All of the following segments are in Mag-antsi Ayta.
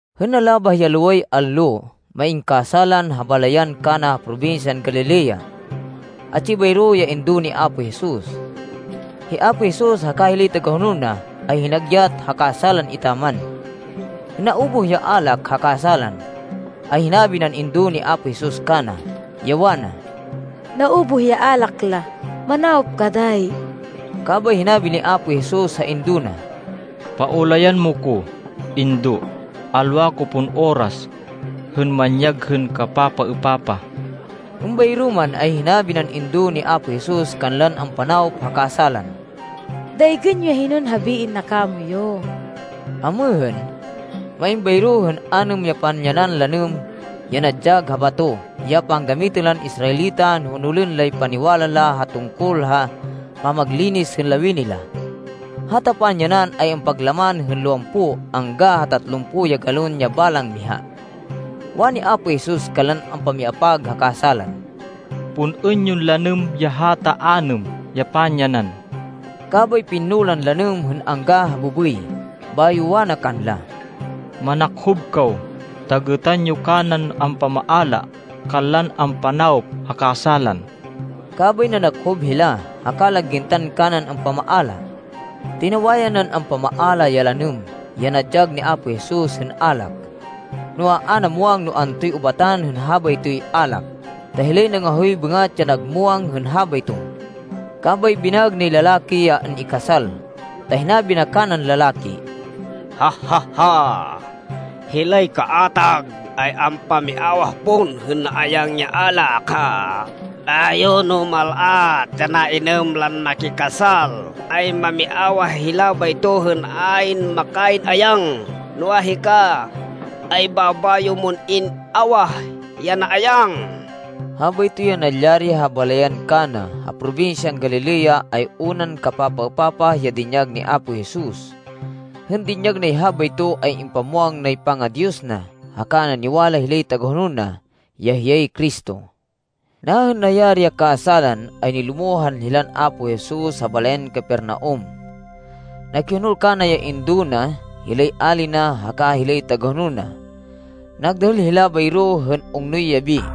Hên nalabah ya loway allo, main kasálan ha balayan Cana ha probinsyan Galilea. Atsi bayro ya indo ni Apo Jesus. Hi Apo Jesus, haka hilay tagahonol na, ay hinagyat ha kasálan etaman. Hên naubuh ya alak ha kasálan, ay hinabi nan indo ni Apo Jesus kana, ya wana, “Naubuh ya alak la. Manawop ka dayi.” Kabay hinabi ni Apo Jesus ha indo na, “Paulayan mo ko, Indo. Alwa ko pon oras, hên manyag hên kapapaêpapah.” Êmbayro man, ay hinabi nan indo ni Apo Jesus kanlan ampanawop ha kasálan, “Daygên yo ya hinon habiên na kamoyu.” Amêhên, main bayro hên anêm ya panyanan lanêm ya nadyag ha bato, ya panggamitên lan Israelita no honolên lay paniwala la hên tungkol ha pamaglinis hên lawini la. Hata panyanan ay ampaglaman hên lowampo angga ha tatlumpo ya galon ya balang miha. Wani Apo Jesus kanlan ampamiapag ha kasálan, “Pun-ên yon lanêm ya hata anêm ya panyanan.” Kabay pinno lan lanêm, hên angga ha bêbêy. Bayo wana kanla, “Manakhob kaw ta gêtan yo kanan ampamaala kanlan ampanawop ha kasálan.” Kabay nanakhob hila, haka la gintan kanan ampamaala. Tinawayan nan ampamaala ya lanêm, ya nadyag ni Apo Jesus hên alak, noa, a na muwang no antoy ubatan hên habaytoy alak, ta hilay nangahoy bêngat, ya nag muwang hên habayto. Kabay binaêg nay lalaki ya an-ikasal. Ta hinabi na kanan lalaki, “Hilay kaatag ay ampamiawah pon hên naayang ya alak. Bayo, no mal-at ya nainêm lan makikasal, ay mamiawah hila bayto hên ayn makayn ayang. Noa, hika, ay babayo mon in-awah ya naayang.” Habayto ya nalyari ha balayan Cana, ha probinsyan Galilea, ay unan kapapaêpapah ya dinyag ni Apo Jesus. Hên dinyag nay habayto, ay impamwang nay panga-Diyos na. Haka naniwala hilay tagahonol na, ya hiyay Cristo. Nahên nayari ya kasálan, ay nilumohan hilan Apo Jesus ha balayan Capernaum. Nakihonol kana ya indo na, hilay ali na, haka hilay tagahonol na. Nagdahêl hila bayro hên ungnoy yabi.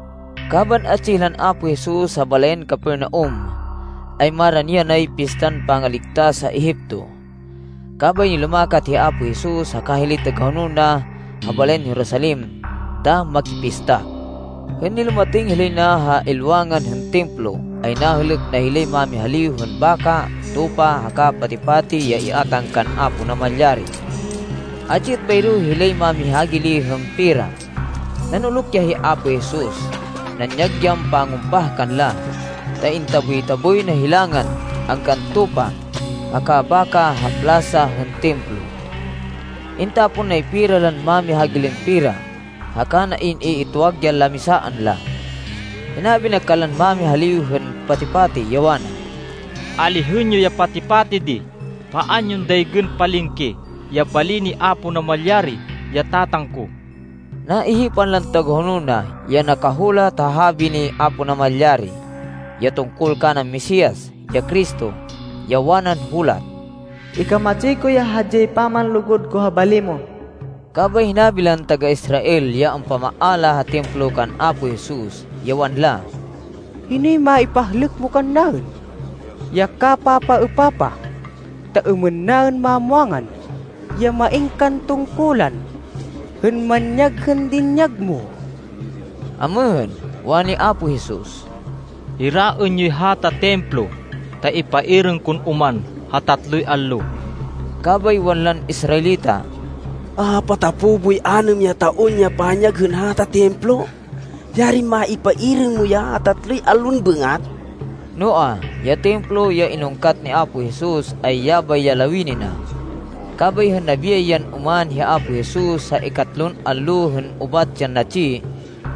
Kaban atsi hilan Apo Jesus ha balayan Capernaum, ay marani yanay Pistan Pangaligtas ha Egipto. Kabay nilumakat hi Apo Jesus haka hilay tagahonol na ha balayan Jerusalem ta makipista. Hên nilumatêng hilay na ha ilwangan hên Templo ay nahêlêk na hilay mámihaliw hên baka, tupa, haka pati-pati ya iátang kan Apo Namalyari. Atsi êt bayro hilay mámihagili hên pera. Nanuluk ya hi Apo Jesus. Nanyag yan pangumpah kanla, ta intaboy-taboy na hilangan, anggan tupa, haka baka ha plasa hên Templo. Intapon nay pera lan mámihagilin pera haka na in-iitwag ya lamisaan la. Hinabi na kanlan mamihaliw hên pati-pati, ya wana, “Alihên yo ya pati-pati di. Paan yon daygên palengke ya bali ni Apo Namalyari, ya Tatang ko.” Naihipan lan tagahonol na, ya nakahulat ha habi ni Apo Namalyari, ya tungkol kanan Mesias, ya Cristo, ya wanan hulat, “Ikamatsi ko ya hadyay pamanlugud ko ha bali mo.” Kabay hinabi lan taga-Israêl ya ampamaala ha Templo kan Apo Jesus, ya wanla, “Hinoy maipahlêk mo kannaên, ya kapapaêpapah, ta êmên naên mamwangan, ya main kan tungkulan hên manyag hên dinyag mo?” Amêhên, wani Apo Jesus, “Hiraên yoy hata Templo, ta ipairêng kon oman ha tatloy allo.” Kabay wanlan Israelita, “Apatapo boy anêm ya taon ya panyag hên hata Templo. Yarin maipairêng mo ya ha tatloy allon bêngat.” Noa, ya Templo ya inungkat ni Apo Jesus, ay yabay ya lawini na. Kabay hên nabiyay yan oman hi Apo Jesus ha ikatlon allo hên ubat yan natsi,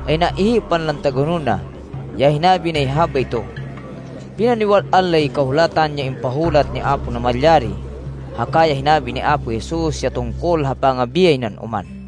ay naihipan lan tagahonol na, ya hinabi nay habayto. Pinaniwal-an lay Kahulatan ya impahulat ni Apo Namalyari, haka ya hinabi ni Apo Jesus ya tungkol ha pangabiyay nan oman.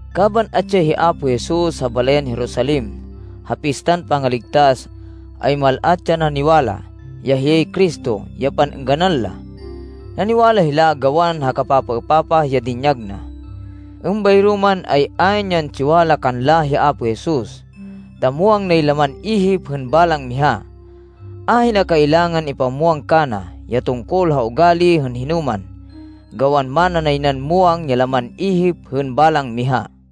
Kaban atsi ya hi Apo Jesus ha balayan Jerusalem, ha Pistan Pangaligtas, ay mal-at ya naniwala, ya hiyay Cristo, ya pan-êngganan la. Naniwala hila, gawan ha kapapaêpapah ya dinyag na. Êmbayro man, ay ayn yan tsiwala kanla hi Apo Jesus, ta muwang nay laman ihip hên balang miha. Ahina kailangan ipamwang kana, ya tungkol ha ugali hên hinoman, gawan mana nay nan muwang ya laman ihip hên balang miha.